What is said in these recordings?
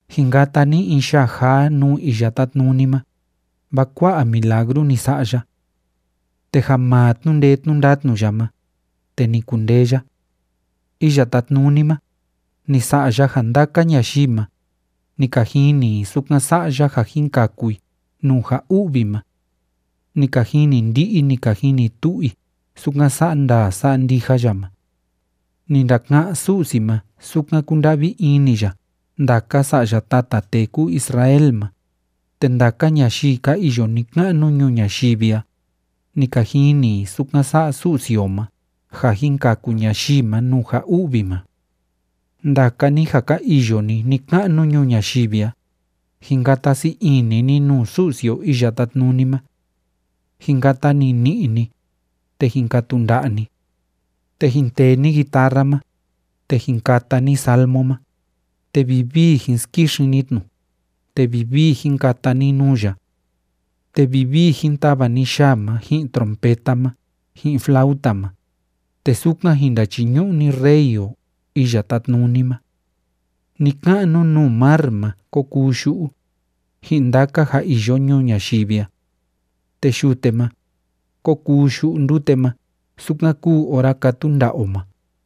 Jin kata ni in yaa jaa nuu Iya Tátnuni ma, vaa kua'a milagru ni sa'a ya. Te ja maa tnu'u ndee tnu'u ndatnu ya ma, te ni kundee ya. Iya Tátnuni ma, ni sa'a ya ja ndaka ñayii ma, ni ka jini i sukan sa'a ya ja jin kaku i nuu ja u'vi ma. Ni ka jini ndi'i, ni ka jini tu'u i sukan sa'a ndaa sa'a ndija ya ma. Ni ndaka'án Su'si ma sukan kúnda'vi ini ya ndaka sa'ya tata tee kúu Israel ma, te ndaka ñayii ka iyo ni‑ka'nu ñuu ñayivi a, ni ka jini i sukan sa'a Su'si o ma ja jin kaku ñayii ma nuu ja u'vi ma. Ndaka ni ja ka iyo ni ni‑ka'nu ñuu ñayivi a, jin kata sii ini ni nuu Su'si o Iya Tátnuni ma. Jin kata nini'i ni, te jin katu nda'a ni. Te jin tee ni guitarra ma, te jin kata ni salmo ma, te vivii jin skixin ni tnu, te vivii jin kata ni nuu ya. Te vivii jin tava ni yaa ma ji'in trompeta ma ji'in flauta ma, te sukan jin ndachiñu'u ni Rey o Iya Tátnuni ma. Ni‑ka'nu nuu mar ma kó kuu yu'u, ji'in ndaka ja iyo ñuu ñayivi a. Te yute ma, kó kuu yu'u ndute ma sukan kúu ora kátu nda'a o ma,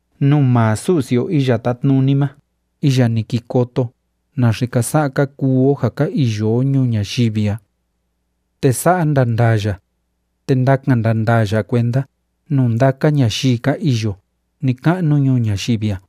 nuu maa Su'si o Iya Tátnuni ma iya ni ki koto naxe ka sa'a ka kuu o ja ka iyo o ñuu ñayivi a. Te sa'a ndandaa ya, te ndakan ndandaa ya kuenda nuu ndaka ñayii ka iyo ni‑ka'nu ñuu ñayivi a.